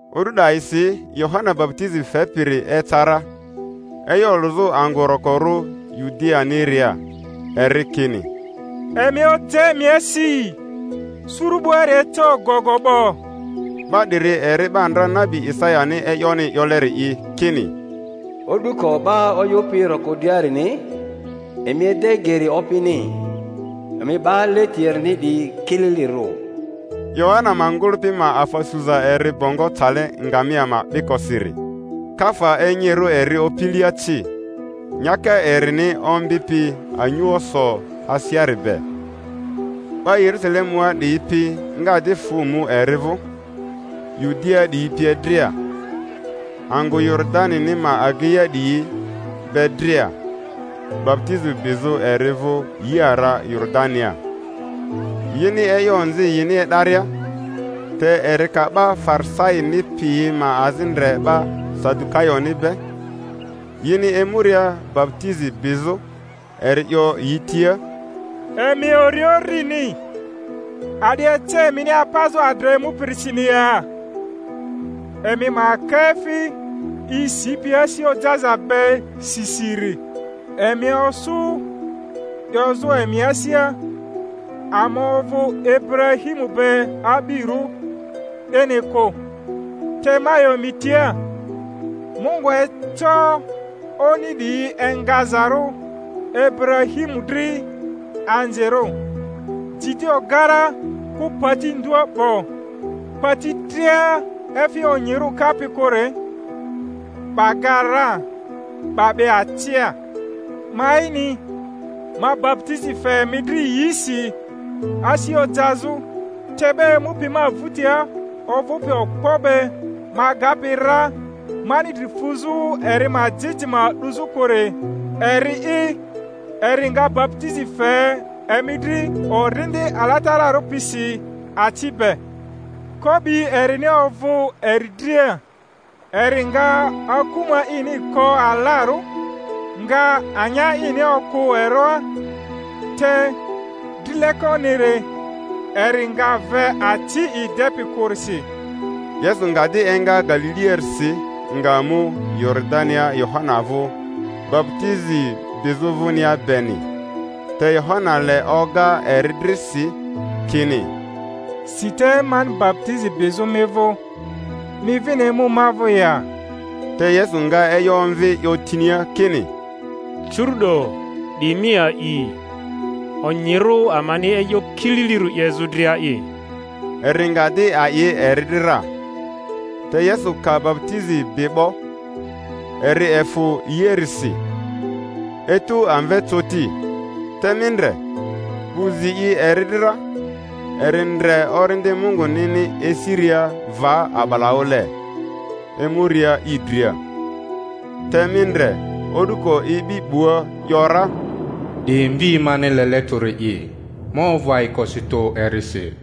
O'du 'dayisi Yohana baputizi fepiri eca ra, e'yo olᴜzᴜ angᴜ rokorᴜ Yudianiria, eri kini, Emi oja emi asi; suru 'buari eca ogogo 'bo. 'Ba 'diri eri 'ba ndra nabi Isayani e'yoni 'yoleri'i, kini, O'duko 'ba oyᴜpi roko driarini: Emi ede geri Opini, emi 'ba leti erini 'diyi kililirᴜ. Yohana ma ngᴜlᴜpi ma afa suza eri bongo cale ngamia ma 'bikosiri, kafa enyirᴜ eri opilia ci; nyaka erini ombi pi anyuoso aseari be. 'Ba Yerusalemua 'diyi pi nga di fᴜ mu eri vᴜ, Yudiaa 'diyi pie dria, angᴜ Yoridani ma ageiaria 'diyi be dria, baputizi bizᴜ eri vᴜ yi ara Yoridania, yini e'yo onzi yini e'daria. Te eri ka 'ba Farisaini piyi ma azi ndre 'ba Sadukayoni be yini emuria baputizi bizᴜ, eri 'yo yi tia, Emi ori urini! A'di ece emini apazᴜ adra emupirisini ya? Emi ma ka efi i sipi asi ojaza be si siri; emi osu 'yozᴜ emi asia, Ama ovᴜ Iburahimu be a'birᴜ, 'dini kᴜ; te ma 'yo emi tia, Mungu eco oni 'diyi engazarᴜ Iburahimu dri anzirᴜ. Ji di ogara, kᴜ pati ndua 'bo; pati dria efi onyirᴜ kapi kᴜri, 'ba ga ra, 'ba 'be acia. Ma'ini, ma baputizi fe emi dri yisi asi ojazᴜ, te 'ba emupi ma vᴜtia ovᴜpi okpo be ma agapi ra, mani dri fuzᴜ eri ma jijima 'duzᴜ kᴜri, eri'i eri nga baputizi fe emi dri Orindi Alatararᴜ pisi aci be. Ko'bi erini ovᴜ eri dria, eri nga akuma ini ko alarᴜ, nga anya ini okᴜ eroa, te drilekoniri eri nga ve aci i depi kᴜrisi. Yesu nga di enga Galiliarisi, nga mu Yoridania Yohana vᴜ, baputizi bizᴜ vᴜnia beni. Te Yohana le oga eri dri si, kini, Si te mani baputizi bizᴜ mi vᴜ, mi vini emu ma vᴜ ya? Te Yesu nga e'yo omvi, 'yo tinia kini, Curu'do di mi a'i; onyirᴜ amani e'yo kililirᴜ 'yezᴜ dria'i. Eri nga di a'i eri dri ra. Te Yesu ka baputizi bi 'bo, eri efᴜ yiarisi, etu amve coti, te mi ndre, 'bu zi i eri dri ra, eri ndre Orindi Mungunini esiria va a'balaᴜle, emuria i dria; te mi ndre, o'duko ibi 'bua, 'yo ra, 'Di Mvi mani lele tᴜri'i, ma ovᴜ ayikosi tᴜ erisi.